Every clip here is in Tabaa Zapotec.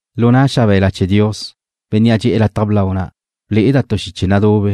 Lu na' xabe̱la chee̱ Dios, Bénnea' dxe'e̱ lataj blau na', ble'eda' tu xiche nadube,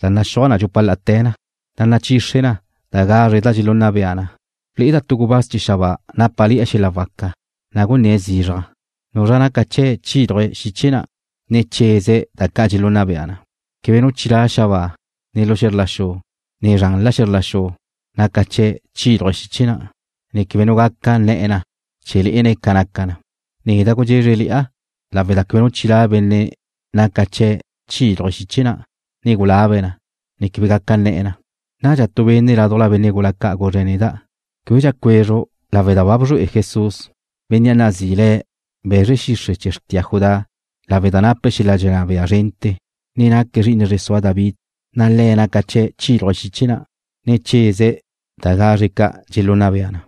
da naxúaj dxupa la'ate̱ na, na' nazriche na gazre da dxelunna bea na. Ble'eda' tu gubáz chee̱ xabáa nápale̱'e̱ xel-la' waca, na' gunné̱' zizraj: ―¿Nuzra naca chee̱' chíluje̱' xiche na', ne cheze̱' da ca' dxelunna bea na? Queba nu chilá' xabáa, ne lu xe̱zr la xu, ne zranla xe̱zr la xu naca chee̱' chíluje' xiche na', ne quebe nu gaca nne̱'e̱ na chee̱ lé'ene̱' ca naca na. Neda' gudxézreli'a lawe' da quebe nu chilá' benne' naca chee̱' chíluje̱' xiche na', ne gulabe̱' na, ne quebe gaca nne̱'e̱ na. Nadxa tu benne' ládujla benne' gula ca' guzre̱' neda': ―Québedxa cuezru' lawe' da ba bzrué'e Jesús, Bénnea' nazi'i le̱' Be̱zre Xixre' chee̱ xrtia Judá lawe' da nape̱' xel-la' dxenná bea zrente̱, ne naque̱' zri'ine zre sua David, na' Le̱' naca chee̱' chíluje̱' xiche na', ne cheze̱' da gazre ca' dxelunna bea na.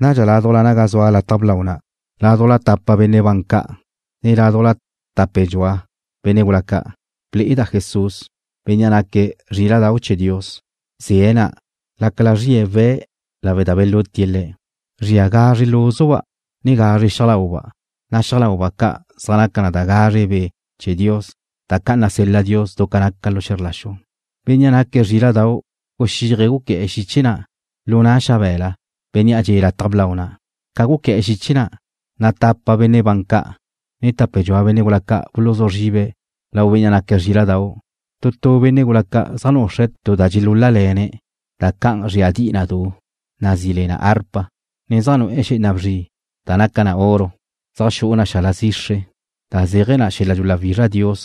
Nadxa ládujla naga zua lataj blau na', ládujla tapa benne' ban ca', ne ládujla tape dxua benne' gula ca', ble'eda' Jesús, Bénnea' naque̱' Zríla'dau' chee̱ Dios. Ze̱'e̱ na', lácala zrie̱' we̱' lawe' da belutie̱' Le̱'. Zria gazre lúzuba' ne gazre xiaj lauba', na' xiaj lauba' ca' zaj naca na gazre Be' chee̱ Dios da ca' nasel-la Dios du ca naca xe̱zr la xu. Bénnea' naque̱' Zríla'dau' guxíaje̱' guqué̱'e̱ xiche na' lu na' xabe̱la Bénnea' dxe'e̱ lataj blau na'. Ca guqué̱'e̱ xiche na', na' tapa benne' ban ca', ne tape dxua benne' gula ca' buluzú zribe̱' lau Bénnea' naque̱' Zríla'dau'. Tu tu benne' gula ca' zaj nuxre̱' tu da dxelúl-lale̱ne̱' da can zríadi'i na du, nazí le na árpa, ne zaj nu'e̱ xé'ena bzri da naca na oro zaj xu'u na xala zixre, da zéaje̱ na xel-la' dxuláwizra Dios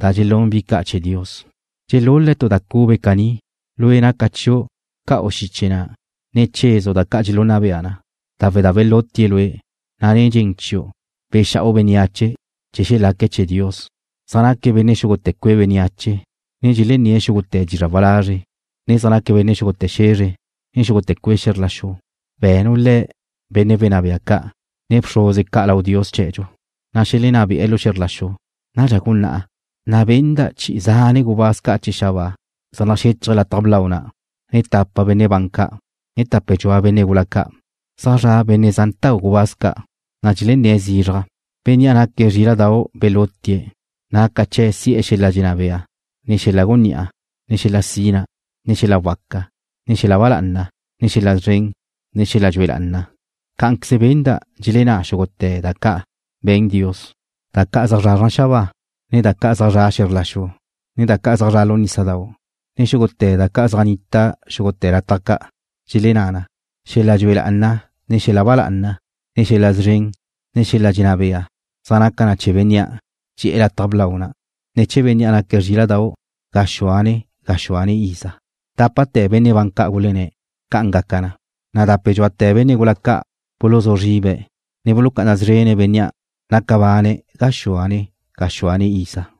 da dxelún bi ca' chee̱ Dios. Dxelul-le̱' tu da cube caní: Lue' naca chiu' ca'u xiche na', ne chezu' da ca' dxelunna bea na, lawe' da belutie̱' Lue', na' nen dxen chiu' bexa'u bénneache chee̱ xelaque̱' chee̱ Dios, Zaj naque̱' benne' xúgute̱ cue' bénneache, ne dxelenné̱' xúgute̱ dizra' walazre', ne zaj naque̱' benne' xúgute̱ xe̱zre ne xúgute̱ cue' xe̱zr la xu. Be̱nu' le̱' benne' wenná bea ca', ne bxruze ca' lau Dios chee̱dxu, na' xelenná be'e̱ lu xe̱zr la xu. Nadxa gunná'a, na' benda' chi'i zane' gubáz ca' chee̱ xabáa zaj naxéchaje̱' lataj blau na', ne tapa benne' ban ca', ne tape dxua benne' gula ca'. Zaj zra' benne' zantau' gubáz ca', na' dxelenné̱' zizraj: Bénnea' naque̱' Zríla'dau' belutie̱', naca chee̱' si'e̱ xel-la' dxenná bea, ne xel-la' gunní'a, ne xel-la' sina, ne xel-la' waca, ne xel-la' ba lá'ana, ne xel-la' szren, ne xel-la' dxue lá'ana. Cá'anqueze benda' dxelenná xúgute̱ da ca' be̱n Dios, da ca' zaj zra' xabáa, ne da ca' zaj zra' xe̱zr la xu, ne da ca' zaj zra' lu nísadau', ne xúgute̱ da ca' zaj nita xúgute̱ lataj ca', dxelenná na: Xel-la' dxue lá'ana, ne xel-la' ba lá'ana, ne xel-la' szren, ne xel-la' dxenná bea zaj naca na chee̱ Bénnea' dxe'e̱ lataj blau na', ne chee̱ bénnea' naque̱' Zríla'dau', gaxúane gaxúane iza. Dápate̱ benne' ban ca' gulenné̱': ―¡Ca'an gaca na! Na' dape dxuate̱ benne' gula ca' buluzú zribe̱', ne bulucá'ana szrene̱' Bénnea' naca bane̱' gaxúane gaxúane iza.